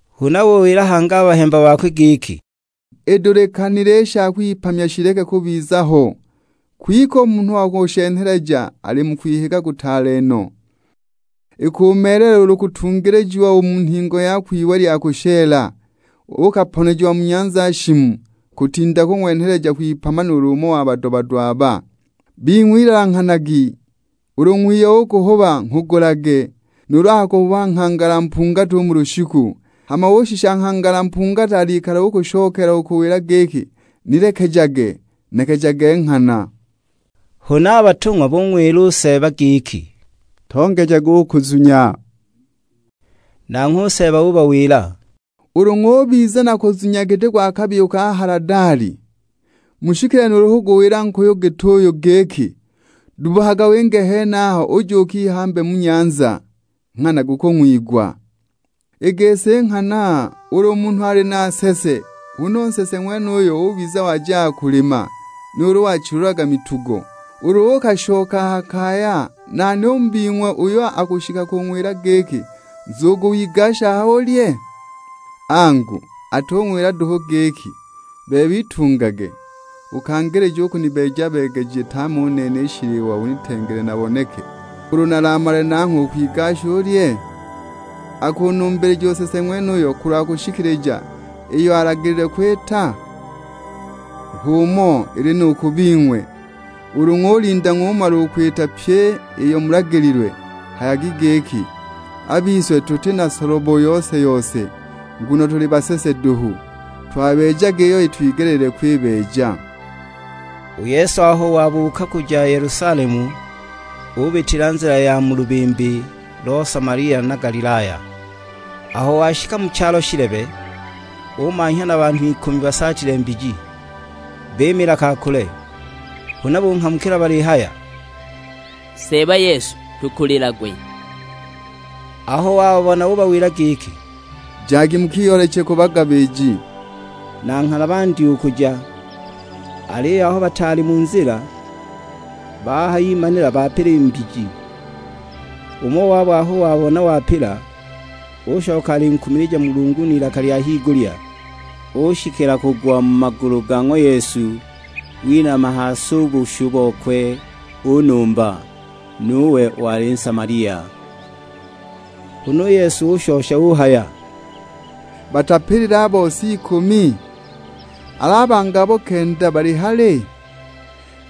Huna ubawila hangi a bahemba bakwe giki, "Itadulikanile i sha kwipamya shileke u kubiza ho; kwike u munhu wa kushenheleja ali mu kwihiga kutaale no! Ikumeelela ulu kutungilijiwa u mu nhingo yakwe iwe lya kushela, uukaponejiwa mu nyanza shimu, kutinda kung'wenheleja kwipama nuulu umo wa bado-bado aba. Bing'we, ilanghanagi; ulu ng'wiyo ukuhuba nghugulage. Nuulu akakuhuba nghangala mpungati u mu lushiku, hama ushisha nghangala mpungati alikala ukushokeela kukuwila giki, 'Nilekejage'; nekejage nghana!" Huna a batung'wa bung'wila u Seeba giki, "Tongejage u kuzunya." Nanghwe u Seeba ubawila, "Ulu ng'ubiza na kuzunya giti gwa kabiyu ka haladali, mushikile nuulu kuguwila nkuyu git'uyu giki, 'Dubbukaga winge a henaho uje ukihambe mu nyanza.' Nghana gukung'wigwa." "I gisi nghana, ulu munhu ali na nsese, huna u nsese ng'wenuyo ubiza wajaga kulima, nuulu wachilulaga mitugo; ulu uukashoka a ha kaya, nani u mu bing'we uyo akushikila kung'wila giki, 'Nzugu wigashe aha ulye?' Angu, atung'wila duhu giki, 'Bebe, itungage ukangilije u kunibeeja-beegeja tame u nene i shiliwa unitengele naboneke; ulu nalamale nangho ukwigasha ulye?' Akunumbilija u nsese ng'wenuyo kulwa kushikilija iyo alagililwe kwita? H'umo ili nu ku bing'we, ulu ng'ulinda ng'umala u kwita pyi iyo mulagililwe, hayagi giki; 'A bise tuti na solobo yose-yose, nguno tuli basese duhu; twabeejaga iyo itwigeleelilwe kwibeeja!' " U Yesu aho wabuuka kuja Yelusalemu ubitila nzila ya mu lubimbi lo Samalia na Galilaya. Aho washika mu chalo shilebe, umanhya na banhu ikumi basaatile mbiji. Bimiila ka kule, huna bunghamukila balihaya, "Seeba Yesu, tukulilagwe!" Aho wababona ubawila giki, "Jagi mukiyooleche ku bagabiji." Na nghana bandya u kuja; aliyo aho bataali mu nzila, bahayimanila bapila i mbiji! Umo wabo aho wabona wapila, ushoka alinkumilija Mulungu n'ilaka lya higulya. Ushikila kugwa mu magulu ga ng'wa Yesu, winama ha si u bushu bokwe unumba; nuwe wali Nsamalia. Huna u Yesu ushosha uhaya, "Batapilile a bose ikumi? Al'a bangi abo kenda bali hali?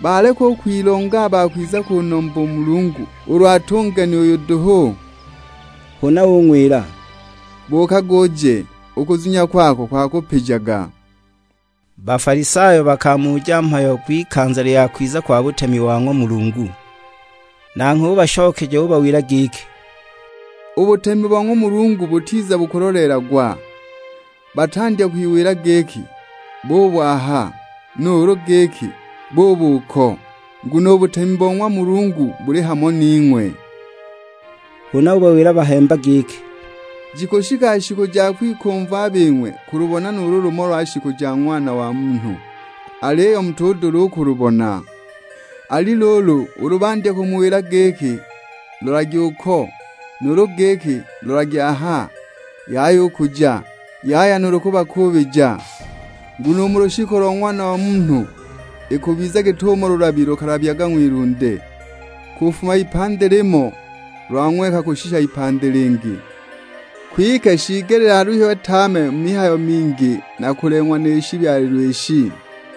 Baleka u kwilonga a ba kwiza kunumba u Mulungu, ulu at'u ngeni uyu duhu?" Huna ung'wila, "Buukaga uje, u kuzunya kwako kwakupijaga." Bafalisayo bakamuja mhayo gw'ikanza lya kwiza kwa butemi bo ng'wa Mulungu. Nanghwe ubashokeja ubawila giki, "U butemi bo ng'wa Mulungu butiza bukuloleelagwa! Batandya kwiwila giki, 'Buub'aha;' nuulu giki, 'Buub'uko;' Nguno u butemi bo ng'wa Mulungu buli hamo ning'we nuulu: mu bing'we.'." Huna ubawila a bahemba giki, "Jikushika shiku ja kwikumva a bing'we kulubona nuulu lumo lwa shiku ja Ng'wana wa Munhu, aliyo mutudula u kulubona. Ali luulu, ulu bandya kumuwila giki, 'Lolagi uko', nuulu giki, 'Lolagi aha,' yaya u kuja, yaya nuulu kubakuubija. Nguno u mu lushiku lo Ng'wana wa Munhu ikubiza git'umo lulabi lukalabyaga ng'wilunde, kufuma ipandi limo; lwang'weka kushisha ipandi lingi. Kwike shiigelile aluhiwe tame mu mihayo mingi na kuleng'wa ni shibyalilwe ishi.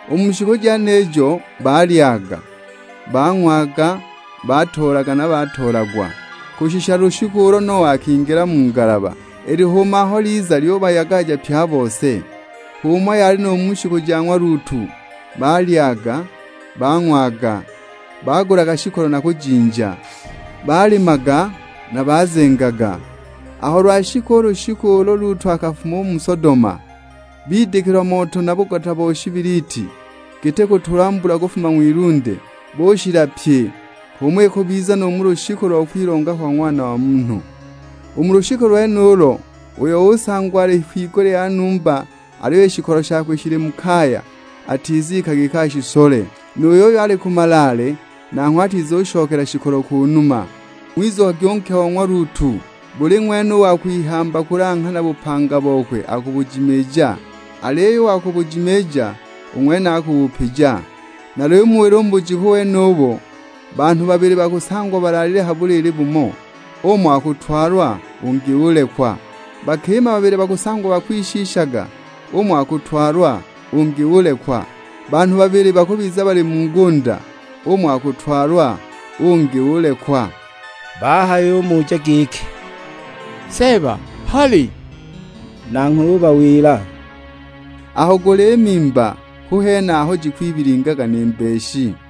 U mu shiku jenijo balyaga, bang'waga, batoolaga, na batoolagwa; kushisha lushiku ulo Noa akingila mu ngalaba. I lihuuma aho liza lyubayagaja pye a bose! H'umo yali nu mu shiku ja ng'wa Lutu; balyaga, bang'waga, bagulaga shikolo na kujinja, balimaga na bazengaga. Aho lwashika u lushiku ulo Lutu akafuma u mu Sodoma, bidikilwa moto na bugota bo shibiliti, giti kutulwa mbula kufuma ng'wilunde, bushila pye! H'umo ikubizila nu mu lushiku lo kwilonga kwa Ng'wana wa Munhu. U mu lushiku lwenulo uyo usangwa ali kwigulya ya numba aliyo i shikolo shakwe shili mu kaya, atizika giki ashisole; nu yuyo ali ku malaale nanghwe atizushokela shikolo ku numa. Ng'wizukagwi u nke o ng'wa Lutu! Buli ng'wene u wa kwihamba kulanghana bupanga bokwe akubujimiija, aliyo u wa kubujimiija, u ng'wene akubupija. Nalimuwila u mu bujiku wenubo, banhu babili bakusangwa balaalile ha buliili bumo, umo akutwalwa ungi ulekwa. Bakima babili bakusangwa bakwishiishaga, umo akutwalwa ungi ulekwa. [ Banhu babili bakubiza bali mu ngunda, umo akutwalwa ungi ulekwa.]" Bahayumuja giki, "Seeba, hali?" Nanghwe ubawila, "Aho guli mimba hu hene aho jikwibilingila ni mbeshi!"